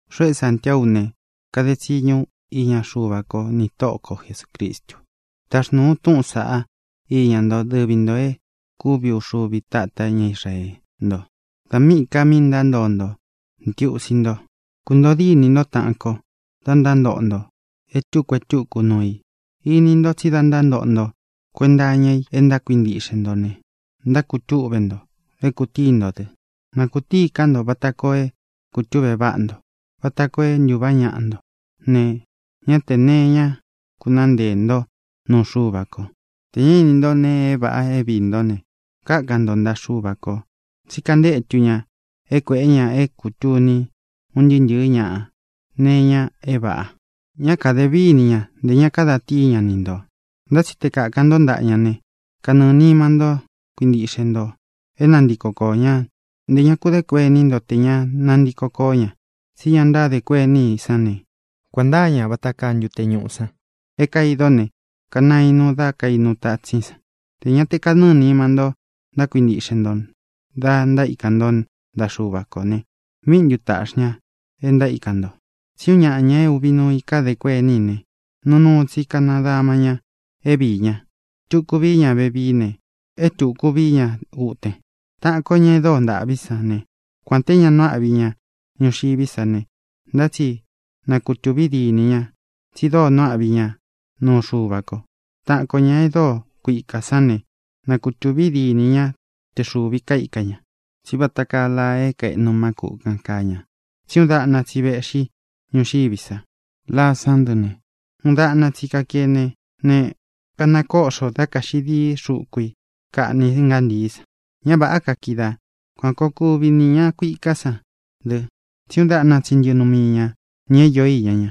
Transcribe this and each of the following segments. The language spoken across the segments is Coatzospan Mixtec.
Xuꞌu é Santiaú u ne, kade tsiñu ú iña Xuva ko ni Tóꞌo ko Jesūcristu. Taxnūu u túꞌūn saꞌá iña nto, dɨvi ntō e kúvi uxuvi táta ña Israeé nto, da míꞌī ká mi ntántoo nto. Ntiusi nto. Kuntoo díni nto, táꞌan ko, da ntántoꞌo nto é tūku e túku nuu i. Ini nto tsí da ntántoꞌo nto kuenta iña i e ntákuintiꞌxe nto ne, ntákutúꞌve nto é kutíi nto dɨ. Na kūtíi ká nto vata koo é kutuꞌve váꞌa nto, vata koo é ntūváꞌa ñaꞌa nto ne, ñá tē nee iñá kunáa nteē ntó nuu Xuva ko. Tē ñá ini nto nee é vāꞌa é viī ntó ne, kákan nto ntaꞌa Xuva kō. Tsí kantétu ña é kuēꞌé ña é kūtuni un ntɨɨ́ ntɨ̄ɨ́ ñaꞌa nee iña é vāꞌa. Ñá kāde víni ña, ntē ña kada tíi ña ni ntō. Ntá tsi te kākan ntó ntaꞌa ña ne, kanɨɨ̄ nima ntó kuintiꞌxe nto é nantiko koō ña. Ntē ña ku dé kuení nto te ña nantiko koó ña. Tsí ña ntádē kuení i sán ne, kuān ntáa ña vata kaa ntute ñuꞌu san é kaido ne, kanainu dá kainu tatsín san. Tē ña te kánɨɨ nima nto ntákuintiꞌxe nto da ntaíkan nto ntaꞌa Xuva kō ne, ¿míꞌi ntu tāꞌxi ña é ntaíkan nto? Tsí uun ñaꞌa, ña é uvi nuu i kade kuení i ne, nuu nuu tsi kanadama ña é viī ña. Tuku vií ña vevií ne, é tūku vií ña uten. Taꞌan ko, ña e dóo ntāꞌví san ne, kuān té ña nuu áꞌvi ña ñuxiví sa ne, ntá tsi na kutūvi dínī ña, tsi dóo nuu áꞌvi ña nuu Xuva ko. Taꞌan ko, ña e dóo kuikā sán ne, na kutūvi dínī ñá te xūvi kaika ña. Tsí vata kaa laa é kaeꞌnu má kūꞌu kan kaa ña. Tsí uun daꞌna tsi véꞌxi ñuxiví sa. Laa sán dɨ ne, uun dáꞌna tsi kakene ne, kanakóꞌxo dá kāxiꞌi dií xuku i kaꞌni ngántií san. Ñá vāꞌá ka kídaā. Kuan kōo kuvi ni ña kuiká san dɨ. Tsí uun daꞌna tsi ntɨꞌɨ nuu mii ña nī é iō iña ña.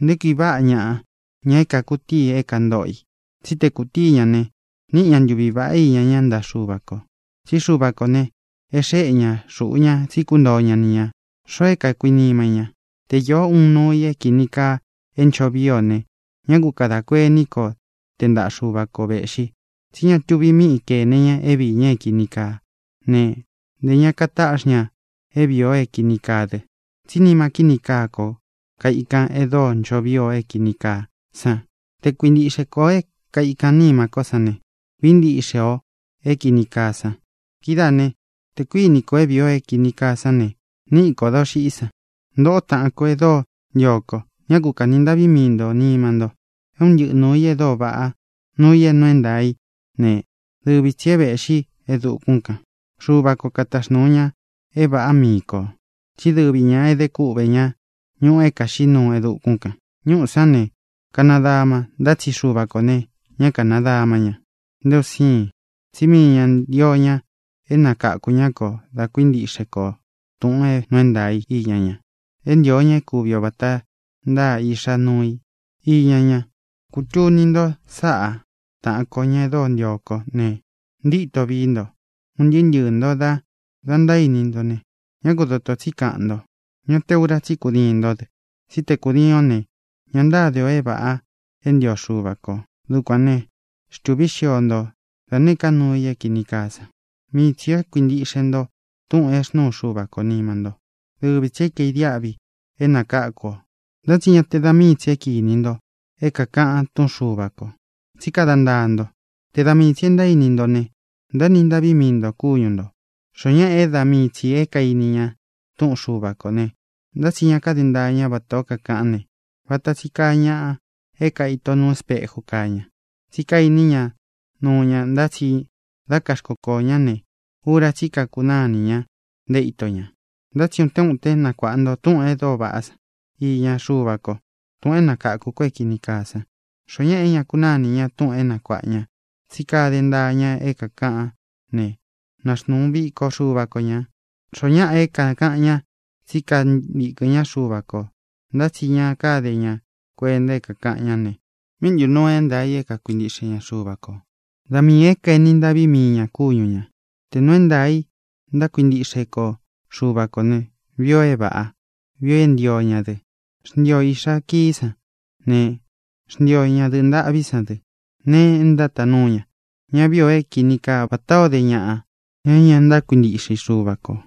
Nté kui váꞌa ñaꞌa, ña é kakutíi i é kantoꞌo i. Tsí te kutíi ña ne, níꞌi ña ntuvi vāꞌa iña ñá ntaꞌa Xuva kō. Tsí Xuva kō ne, e xéꞌe ñā xuꞌu ña tsí kuntoo ña ni ñā, xoo é kākuinima í ña. Te īó uun nuu ī é kīni kaa é ncho víi o ne, ñá ku kadā kuení ko te ntaꞌa Xuva ko vēꞌxi, tsí ña túvi míꞌi kēne ña é viī ña é kīni kaa né, ntē ña katáꞌxi ña é vīi o é kīni kaa dɨ. Tsí nima kíni kaa ko kaikan e dóo ncho vii o é kīni kaa san. Te kuintiꞌxe kō é kaīkan níma kó san ne, vií ntiꞌxe ō é kīni kaa san. Kidáā né, tē kuíni kō é vīi o é kīni kaa san ne, níꞌi kō doxiꞌí san. Ntōꞌo táꞌān ko e dóo ntio ko, ñá ku kanī ntaꞌví mii ntō nima nto. É un ntɨꞌɨ nuū i e dóo vaꞌa, nuu i é nuu é ntaā í ne, dɨvi tsī é vēꞌxi e dukún kān. Xuva ko kataxnūu ña é vāꞌá mii kō. Tsí dɨvi ñā ede kúꞌvē ña ñuꞌu é kāxiꞌí nuu e dukún kān. Ñúꞌū sán ne, kanadama, ntá tsi Xuva kō ne, ña kanadama ña nté un siin. Tsí mii ñā ntío ña é nakáku ña kō da kuíntiꞌxe ko tūꞌun é nuu é ntaā i iña ña é ntio ña é kuvi ō vata ntáa iꞌxa nuu i íña ña. Kutuni nto sáꞌa, taꞌan ko, ña e dóo ntio kó ne, ntíto vií nto, un ntɨɨ́ ntɨɨ̄ nto, dá ntaíni nto ne, ñá ku dotō tsí kaꞌan nto. Ñá te ūra tsí kudiín nto dɨ. Tsí te kūdiin ó ne, ñá ntáde o é vāꞌa é ntio Xuva kō. Dukuān né, xtūví xio nto da nēé ka nuu i é kīni kaa san. Mii tsī é kuintiꞌxe nto túꞌūn e xnúu Xuva kō nima nto. Dɨvi tsī é kaidiáꞌvi é nakáku ō. Ntá tsi ña te da mii tsī é kini nto é kākaꞌan túꞌun Xuva kō, tsí kada ntaa nto. Te da mii tsī e ntaíni nto ne, ntaéni ntaꞌví mii ntō kúñu ntō. Xoó ñaꞌa é da mii tsī e kaíni ña túꞌun Xuva kō ne, ntá tsi ña káde ntaa ña vatā ó kakaꞌán ne, vata tsi kaa ña é kaito nuu speju kaa ña. Tsí kainí ña nuu ña, ntá tsi dá kaxkokoō ñá ne, ura tsí i kakunaá ini ña nté ito ña. Ntá tsi utén utén nakuāꞌa nto túꞌūn e dóo vaꞌá san iña Xuva ko, túꞌūn é nakākú kō é kīni kaa san. Xoó ñaꞌa é ña kunáa ini ña túꞌūn é nakuāꞌa ña, tsí kade ntaa ña é kākaꞌán ne, naxnuu viko Xuva ko ñā. Xoó ñaꞌa é kākaꞌan ña tsí kantīkɨn ñá Xuva kō, ntá tsi ña káde ña kuenta é kākaꞌan ñá ne, ¿míꞌi ntū nuu é ntaā i é kakuintiꞌxe ña Xuva kō? Da miī é kaeni ntāꞌví mii ñā kúñu ñā. Te nūu é ntaā í ntákuintiꞌxe ko Xuva kō né, viī o é vāꞌá, viī o é ntio ña dɨ. Xntii ō á iꞌxa kií san ne, xntii o ña dɨ̄ꞌɨ ntâꞌví san dɨ nēe e ntátaan núu ña. Ñá viī o é kīni kaá vatā ó de ñaꞌa, ña é ña ntákuintiꞌxe i Xuva kō.